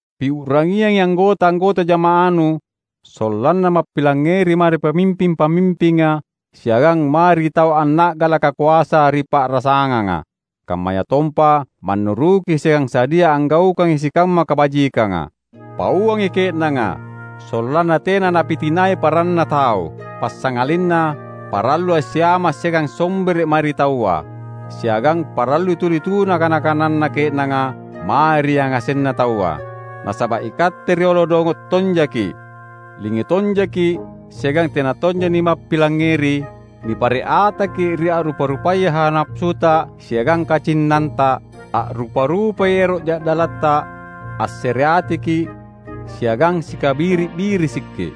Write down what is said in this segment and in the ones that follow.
Piu’rangiangi anggota-anggota jama’anu sollanna mappilangngeri mae ri pamimping-pamimpinga siagang mae ri tau anna’galaka koasa ri pa’rasanganga; kammayatompa mannuruki siagang sadia anggaukangi sikamma kabajikanga. Pauangi ke’nanga sollanna tena napitinai paranna tau, passangalinna parallui assiama’ siagang sombere’ mae ri taua. Siagang parallui tuli tuna kana-kananna ke’nanga mae ri yangasenna taua. Nasaba’ ikatte riolo dongo’ tonjaki’, lingu tonjaki’ siagang tena tonja nimappilangngeri. Nipare’ ataki’ ri a’rupa-rupaya hawa napasuta siagang kacinnanta; a’rupa-rupai ero’ ja’dalatta, assereatiki’, siagang sikabiri’-birisiki’.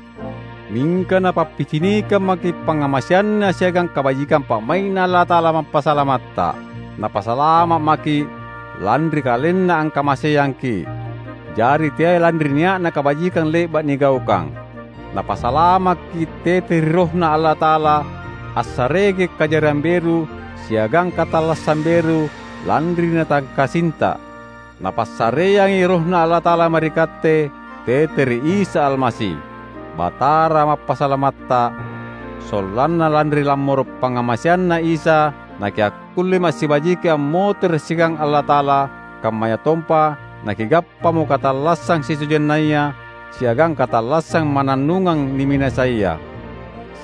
Mingka Napappicinikang maki’ pangngamaseanNa siagang kabajikang pa’mai’Na Allata’ala Mappasalamatta. Napasalama’ maki’, lanri KalenNa angkamaseangki’, jari teai lanri nia’na kabajikang le’ba’ nigaukang. Napasalamakki’ tete ri RohNa Allata’ala assareaki’ kajariang beru siagang katallassang beru lanri Natangkasinta. Napassareangi RohNa Allata’ala mae ri katte tete ri Isa Almasi, Batara Mappasalamatta; sollanna lanri lammoro’ pangngamaseanNa Isa nakiakkullemo assibajiki ammotere’ siagang Allata’ala kammayatompa nakigappamo katallassang sitojennaya siagang katallassang mannannungang niminasaia.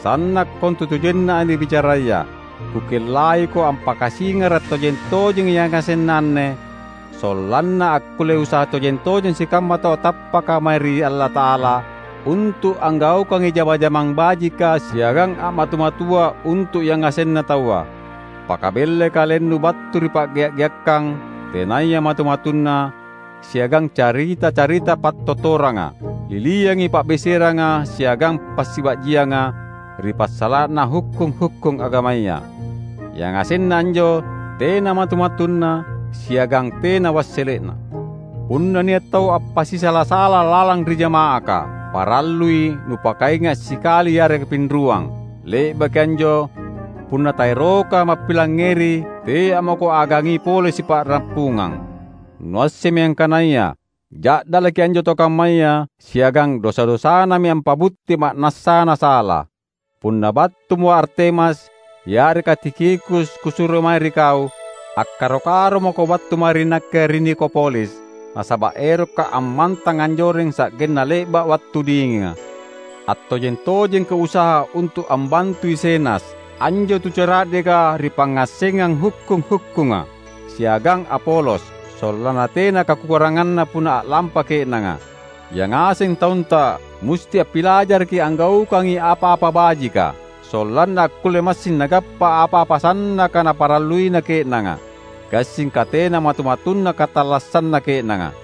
Sanna’ kontutojenna anne bicaraya. Kukellaiko ampakasingara’ tojeng-tojengi yangasenna anne, sollanna akkulle usaha tojeng-tojeng sikamma tau tappaka mae ri Allata’ala, untu’ anggaukangi jama-jamang bajika siagang a’matu-matua untu’ yangasenna taua. Pakabellai kalennu battu ri pa’gea’-geakkang tenaya matu-matunna siagang carita-carita pattottoranga. Liliangi pa’beseranga siagang passiba’jianga ri passala’na hukkung-hukkung agamaya. Yangasenna anjo tena matu-matunna siagang tena wassele’na. Punna nia’ tau appasisala-sala lalang ri jama’aka, parallui nupakainga’ sikali yareka pinruang; le’baki anjo punna taeroka mappilangngeri tea’ mako agangi pole sipa’rappungang. Nuassemmi angkanaya ja’dalaki anjo tau kammaya siagang dosa-dosanami ampa’butti ma’nassana sala. Punna battumo Artemas yareka Tikhikus kusuro mae ri kau, akkaro-karo mako battu mae ri nakke ri Nikopolis, nasaba’ erokka’ ammantang anjoreng sa’genna le’ba’ wattu dinginga. Attojeng-tojengko usaha untu’ ambantui Zenas, anjo tu cara’deka ri pangngassengang hukkung-hukkunga, siagang Apolos; sollanna tena kakuranganna punna a’lampa ke’nanga. Yangaseng taunta musti appilajaraki anggaukangi apa-apa bajika, sollanna akkulle massing nagappa apa-apa sannaka naparalluina ke’nanga; gassingka tena matu-matunna katallassanna ke’nanga.